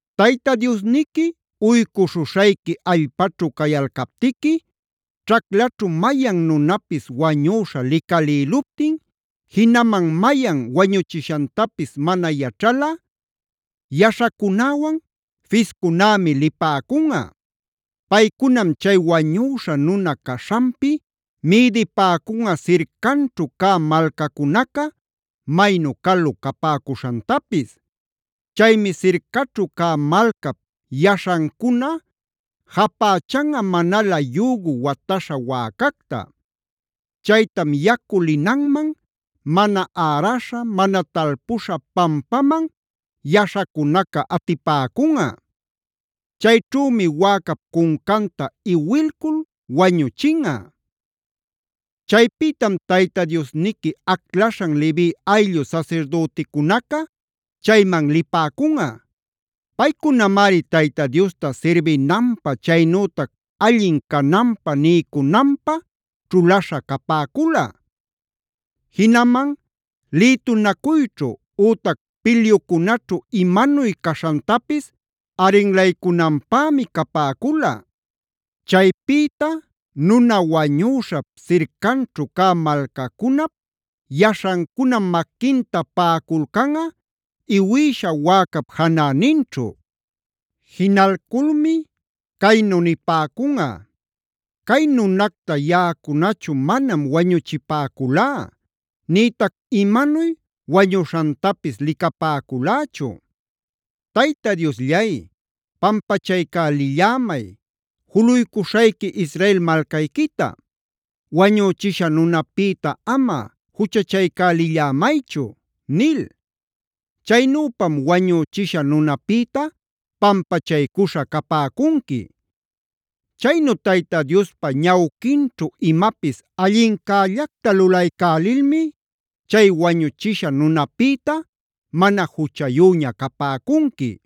“Tayta Diosniqui uycuśhuśhayqui allpaćhu cayalcaptiqui ćhaclaćhu mayan nunapis wañüśha licalïluptin, jinaman mayan wañuchishantapis mana yaćhalꞌa, yaśhacunäwan fiscunämi lipäcunꞌa. Paycunam chay wañüśha nuna caśhanpi mïdipäcunꞌa sircanćhu cä malcacunaca maynu calu capäcuśhantapis. Chaymi sircaćhu cä malcap yaśhancuna japächanꞌa manalä yügu wataśha wäcacta. Chaytam yacu linanman, mana äraśha, mana talpuśha pampaman yaśhacunaca atipäcunꞌa. Chayćhümi wäcap cuncanta iwilcul wañuchinꞌa. “Chaypïtam Tayta Diosniqui aclaśhan Levi ayllu sasirdüticunaca chayman lipäcunꞌa. Paycunamari Tayta Diosta sirbinanpä chaynütac allin cananpä niycunanpä ćhulaśha capäcula. Jinaman lïtunacuyćhu ütac pilyucunaćhu imanuy caśhantapis aringlaycünanpämi capäcula. Chaypïta nuna wañüśhap sircanćhu cä malcacunap yaśhancunam maquinta paꞌaculcanꞌa iwïsha wäcap janäninćhu. Jinalculmi caynu nipäcunꞌa: ‘Cay nunacta yaꞌacunachu manam wañuchipäculá nïtac imanuy wañuśhantapis licapäculächu. Tayta Diosllay, pampachaycälillämay juluycuśhayqui Israel malcayquita; wañüchisha nunapïta ama juchachaycälillämaychu’ nil. Chaynüpam wañüchisha nunapïta pampachaycuśha capäcunqui. Chaynu Tayta Diospa ñawquinćhu imapis allincällacta lulaycälilmi chay wañüchisha nunapïta mana juchayüña capäcunqui.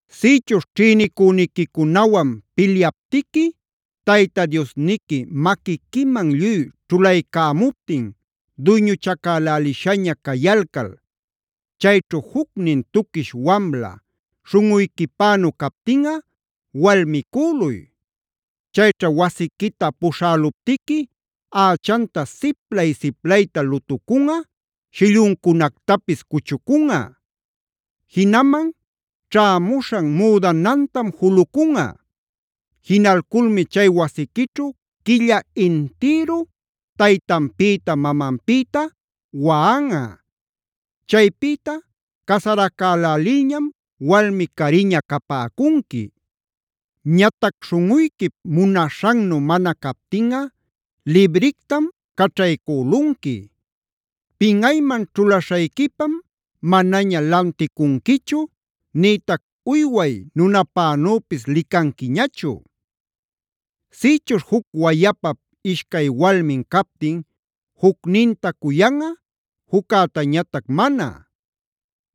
“Sïchuśh ćhïnicüniquicunawan pilyaptiqui Tayta Diosniqui maquiquiman lluy ćhulaycämuptin duyñuchacälälishaña cayalcal, chayćhu jucnin tuquish wamla śhunꞌuyquipänu captinꞌa walmicüluy. Chayćha wasiquita puśhäluptiqui ächanta siplay-siplayta lutucunꞌa, shilluncunactapis cuchucunꞌa. Jinaman ćhämuśhan müdanantam julucunꞌa. Jinalculmi chay wasiquićhu quilla intïru taytanpïta mamanpïta waꞌanꞌa. Chaypïta casaracälälilñam walmi cariña capäcunqui. Ñatac śhunꞌuyquip munaśhannu mana captinꞌa librictam caćhaycülunqui. Pinꞌayman ćhulaśhayquipam manaña lanticunquichu nïtac uyway nunapänüpis licanquiñachu. “Sïchuśh juc wayapap ishcay walmin captin jucninta cuyanꞌa, juccätañatac mana.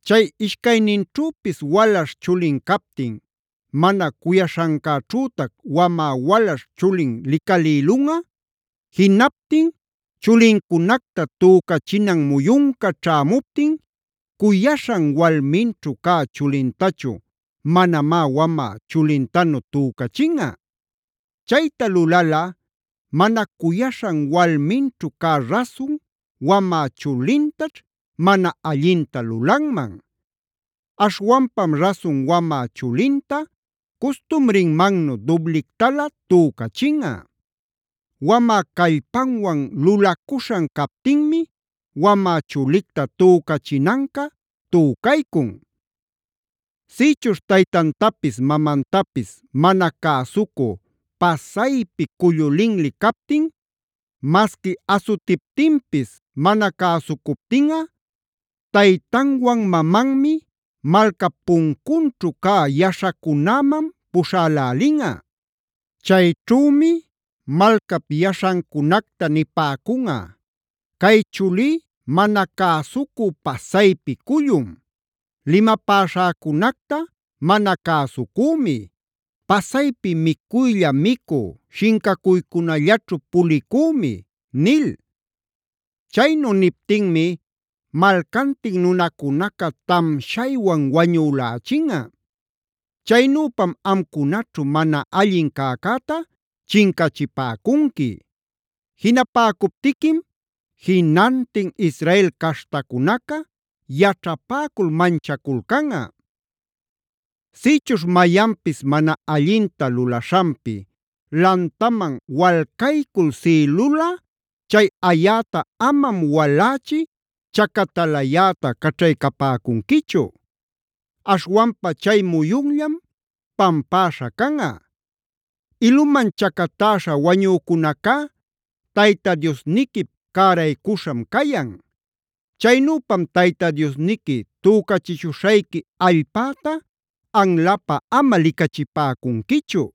Chay ishcayninćhüpis walaśh chulin captin, mana cuyaśhancäćhütac wamä walaśh chulin licalïlunꞌa; jinaptin chulincunacta tücachinan muyunca ćhämuptin cuyaśhan walminćhu cä chulintachu manamá wamä chulintanu tücachinꞌa. Chayta lulalꞌa mana cuyaśhan walminćhu cä rasun wamä chulintaćh mana allinta lulanman. Aśhwanpam rasun wamä chulinta custumrinmannu dublictalä tücachinꞌa. Wamä callpanwan lulacuśhan captinmi wämä chulicta tücachinancä tücaycun. “Sïchuśh taytantapis mamantapis mana cäsucu pasaypi cullu linli captin, masqui asutiptinpis mana cäsucuptinꞌa, taytanwan mamanmi malcap puncunćhu cä yaśhacunäman puśhälälinꞌa. Chayćhümi malcap yaśhancunacta nipäcunꞌa: ‘Cay chulí mana cäsucu pasaypi cullum. Limapäśhäcunacta mana cäsucümi; pasaypi micuylla micu shincacuycunallaćhu pulicümi’ nil. Chaynu niptinmi malcantin nunacunaca tamshaywan wañülächinꞌa. Chaynüpam amcunaćhu mana allin cäcäta chincachipäcunqui. Jinapäcuptiquim jinantin Israel caśhtacunaca yaćhapäcul manchaculcanꞌa. “Sïchuśh mayanpis mana allinta lulaśhanpi lantaman walcaycul siꞌilulꞌa, chay ayäta amam walächi chacatalayäta caćhaycapäcunquichu. Aśhwanpa chay muyunllam pampäśha canꞌa. Iluman chacatäśha wañücunacá Tayta Diosniquip cäraycuśham cayan.a Chaynüpam Tayta Diosniqui tücachishuśhayqui allpäta anlapä ama licachipäcunquichu.